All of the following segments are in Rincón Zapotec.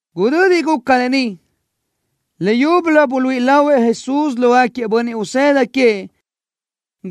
Gudödi guca lë ni, leyúbölö buluíʼi lahuëʼ Jesús lógaquiëʼ bönniʼ usëda queëʼ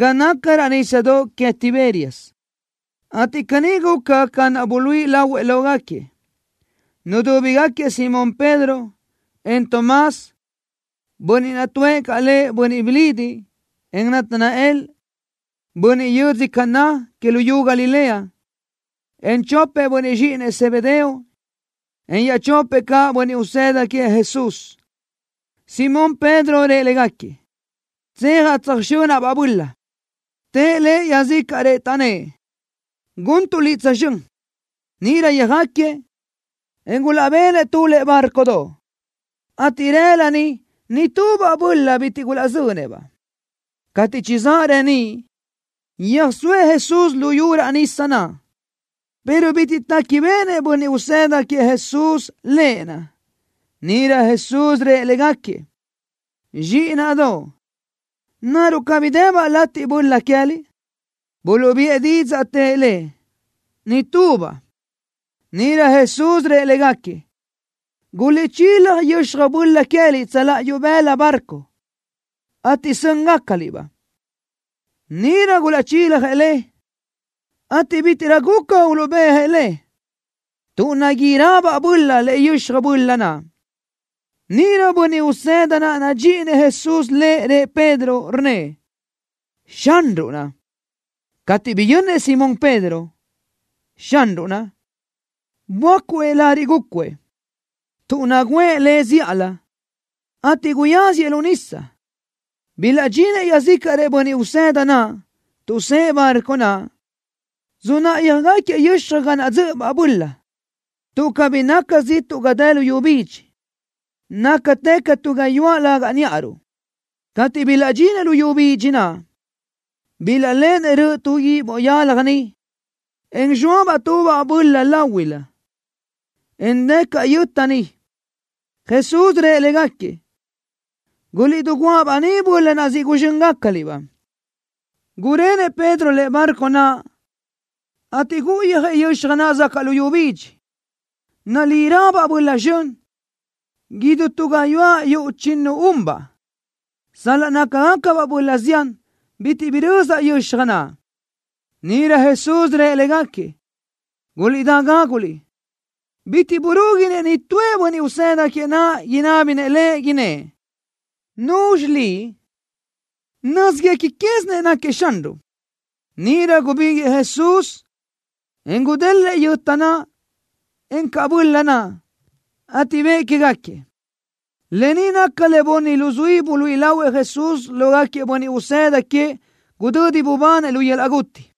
ga naca raʼ nísadoʼ que Tiberias, ateʼ caní guca ca naʼ buluíʼi lahuëʼ lógaquiëʼ. Nudúbigaquiëʼ Simón Pedro, en Tomás, bönniʼ naʼ tuʼë caʼ lëʼ Bönniʼ Bilidiʼ, en Natanael, bönniʼ yödzö Caná que luyú Galilea, en chopëʼ bönniʼ zxíʼinëʼ Zebedeo, en iaʼchopëʼ caʼ bönniʼ usëda queëʼ Jesús. Simón Pedro rëʼ légaquiëʼ: —Tseajaʼ tsöjxönaʼ-baʼ böla. Tëʼ lëʼ iaʼzícaʼrëʼ, taʼnnë́ʼ: —Guntuʼ liʼ tsözxö́n. Níʼirö yöjáquiëʼ, en gulaʼbenëʼ tu lëʼe bárcodoʼ, ateʼ rëla niʼ nitubaʼ böla bitiʼ gulaʼzönëʼ-baʼ. Cateʼ chizáʼ reníʼ, yöjsóëʼ Jesús luyú raʼ nisa naʼ, pero bitiʼ téquibeʼenëʼ bönniʼ usëda queëʼ Jesús Lëʼ naʼ. Níʼirö Jesús rëʼ légaquiëʼ: —Zxíʼinaʼdoʼ, ¿naruʼ cabí debaʼ latiʼ böla queë́liʼ? Buluʼbiʼë didzaʼ, tëʼ Lëʼ: —Nitubaʼ. Níʼirö Jesús rëʼ légaquiëʼ: —Guliʼchílaj yöxaj böla queë́liʼ tsöláʼa ibëla barco, ateʼ sö́ngacaliʼ-baʼ. Níʼirö gulaʼchiljëʼ le, ateʼ bítiʼrö guca uluʼbéajëʼ le, tuʼ naguírabaʼ böla lëʼe yöxaj böla naʼ. Níʼirö bönniʼ usëda naʼ nadxíʼinëʼ Jesús lëʼ rëʼ Pedro, rnnëʼ: —¡Xanruʼ naʼ! Cateʼ biyönnëʼ Simón Pedro, “Xanruʼ naʼ”, böácuëʼ lariʼ gúcuëʼ, tuʼ nagǘëʼ le zíʼalö, ateʼ guyáziëʼ lu nisa. Bilaʼdxinëʼ iaʼzícaʼrëʼ bönniʼ usëda naʼ, tuʼsë́ʼë barco naʼ, sunáʼayöjgaquiëʼ yöxaj ga naʼ dzö́ʼöbaʼ böla, tuʼ cabí naca ziʼtuʼ ga dë luyú bidxi. Nácatë ca tu gayuáʼ lögaʼ níʼaruʼ. Cateʼ bilaʼdxinëʼ luyú bidxi naʼ, bilaʼléʼenëʼ röʼö tu guíʼ boʼ yalaj niʼ, en zxóabaʼ tubaʼ böla láhuilö, en dë caʼ yöta niʼ. Jesús rëʼ légaquiëʼ: —Guliʼdiguáʼa-baʼ ni böla naʼ siʼ guzxö́ngacaliʼ-baʼ. Gurenëʼ Pedro lëʼe barco naʼ, ateʼ gúʼuyöjëʼ yöxaj naʼ zacaʼ luyú bidxi, nalírö-baʼ böla zxön, idú tu gayuáʼ yuʼ chíʼinu-unbaʼ. Sal-laʼ nácagacabaʼ böla zián, bitiʼ birözaʼ yöxaj naʼ. Níʼirö Jesús rëʼ légaquiëʼ: —Guliʼdá gáguliʼ. Bitiʼ burúguinëʼ nitúëʼ bönniʼ usëda queëʼ naʼ inábinëʼ Lëʼ, innë́ʼ: “¿Nuzxi Liʼ?” Nö́zguequi quézinëʼ náquiëʼ Xanruʼ. Níʼirö gubíguiʼë Jesús, en gudélëʼë yöta naʼ, encaʼ böla naʼ, ateʼ bëʼë quégaquiëʼ. Lë ni naca le bunni luzuí buluíʼi lahuëʼ Jesús lógaquiëʼ bönniʼ usëda queëʼ gudödi bubanëʼ lu yöl-laʼ guti.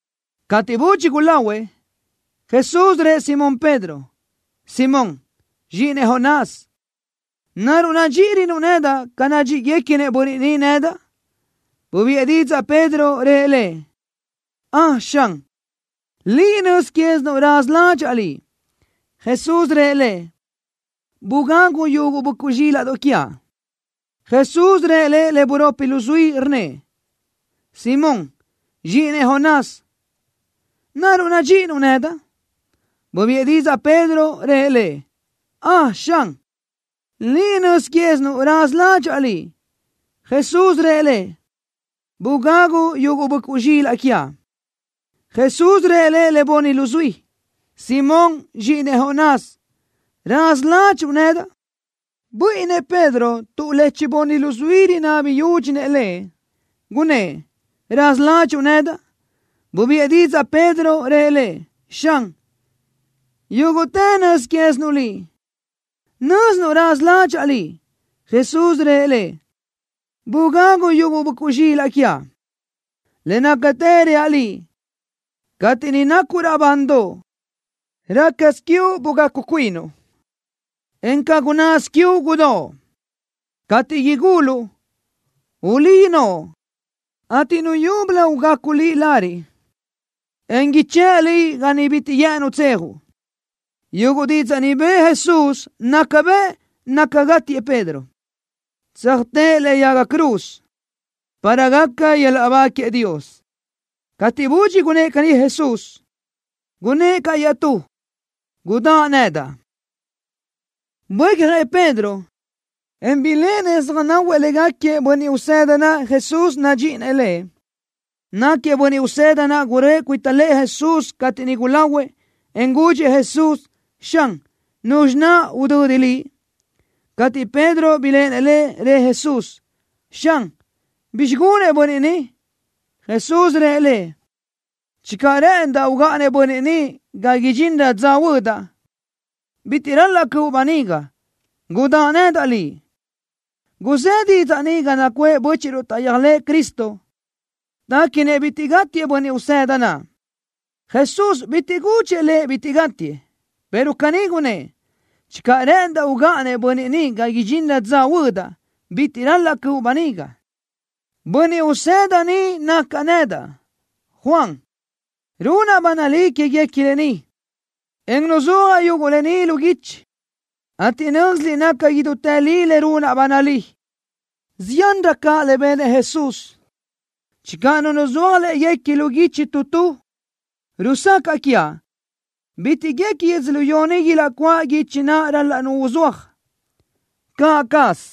Cateʼ budxi gulahuëʼ, Jesús rëʼ Simón Pedro: —Simón, zxíʼinëʼ Jonás, ¿naruʼ nadxíʼirönuʼ nedaʼ ca nadxíʼiguequinëʼ bönniʼ ni nedaʼ? Bubiʼë didzaʼ Pedro, rëʼ Lëʼ: —Ön, Xan. Liʼ nöz quézinuʼ raza ládxaʼa Liʼ. Jesús rëʼ lëʼ: —Bugagu yuguʼ böʼcuʼ zxílaʼdoʼ quiaʼ. Jesús rëʼ lëʼ le buropi luzuí, rnnëʼ: —Simón, zxíʼinëʼ Jonás, ¿naruʼ nadxíʼinuʼ nedaʼ? Bubiʼë didzaʼ Pedro, rëʼ Lëʼ: —Ön, Xan. Liʼ nöz quézinuʼ raza ládxaʼa Liʼ. Jesús rëʼ lëʼ: —Bugagu yuguʼ böʼcuʼ zxilaʼ quiaʼ. Jesús rëʼ lëʼ le bunni luzuí: —Simón, zxíʼinëʼ Jonás, ¿raza ládxuʼu nedaʼ? Buíʼinnëʼ Pedro tuʼ le chibunni luzuí rinabi yúdxinëʼ lëʼ, gunnë́ʼ: “¿Raza ládxuʼu nedaʼ?” Bubiʼë didzaʼ Pedro, rëʼ Lëʼ: —Xan, yúguʼtë nöz quézinuʼ Liʼ. Nö́zinuʼ raza ládxaʼa Liʼ. Jesús rëʼ lëʼ: —Bugagu yuguʼ böʼcuʼ zxilaʼ quiaʼ. Le nácatë reaʼ liʼ, cateʼ niʼ nacuʼ raʼbandoʼ, rácasö quiuʼ bugacu cuinuʼ, en ca gunnásö quiuʼ gudóʼ. Cateʼ iguluʼ, ulí noʼo, ateʼ nu yúbölö ugacu liʼ lariʼ, en ichë́ʼ liʼ ga niʼ bitiʼ guë́ʼënnuʼ tseajuʼ. Yuguʼ didzaʼ ni bëʼë Jesús naca bëʼ naca gátiëʼ Pedro, tsöjtë́ʼë lëʼe yaga cruz, para gaca yöl-laʼ ba queëʼ Dios. Cateʼ budxi gunnë́ʼ caní Jesús, gunnë́ʼ caʼ iaʼtú: —Gudáʼ nedaʼ. Buécjëʼ Pedro, en biléʼenëʼ söjnáhuëʼ légaquiëʼ bönniʼ usëda naʼ Jesús nadxíʼinëʼ lëʼ. Náquiëʼ bönniʼ usëda naʼ guröʼë cuita lëʼë Jesús cateʼ niʼ gulahuëʼ, en gudxëʼ Jesús: “Xan, ¿nuzxi naʼ udödi Liʼ?” Cateʼ Pedro biléʼenëʼ lëʼ, rëʼ Jesús: —Xan, ¿bizxi gunëʼ bönniʼ ni? Jesús rëʼ lëʼ: —Channö rë́ʼëndaʼ ugáʼanëʼ bönniʼ ni ga idxinrö dza huödaʼ, bitiʼ ral-laʼ cöʼu böniga. Gudáʼa nedaʼ liʼ. Guzë́ didzaʼ ni ga nacuʼë bö́chiʼruʼ taʼyéajlëʼë Cristo. Téquinëʼ bitiʼ gátiëʼ bönniʼ usëda naʼ. Jesús bitiʼ gudxëʼ lëʼ bitiʼ gátiëʼ, pero caní gunnë́ʼ: “Channö rë́ʼëndaʼ ugáʼanëʼ bönniʼ ni ga idxinrö dza huödaʼ, bitiʼ ral-laʼ cöʼu böniga.” Bönniʼ usëda ni nacaʼ nedaʼ, Juan. Runaʼ ba nalí quéguequi lë ni, en nuzúajaʼ yuguʼ lë ni lu guichi, ateʼ nö́ziliʼ naca idútë li le runaʼ ba nalí. Ziánrö caʼ le benëʼ Jesús. Channö nu uzúaj léguequi lu guichi tu tu, rusacaʼ quiaʼ bitiʼ guequi yödzölió ni ilaʼcuáʼ guichi naʼ ral-laʼ nu uzúaj. Caʼ caz.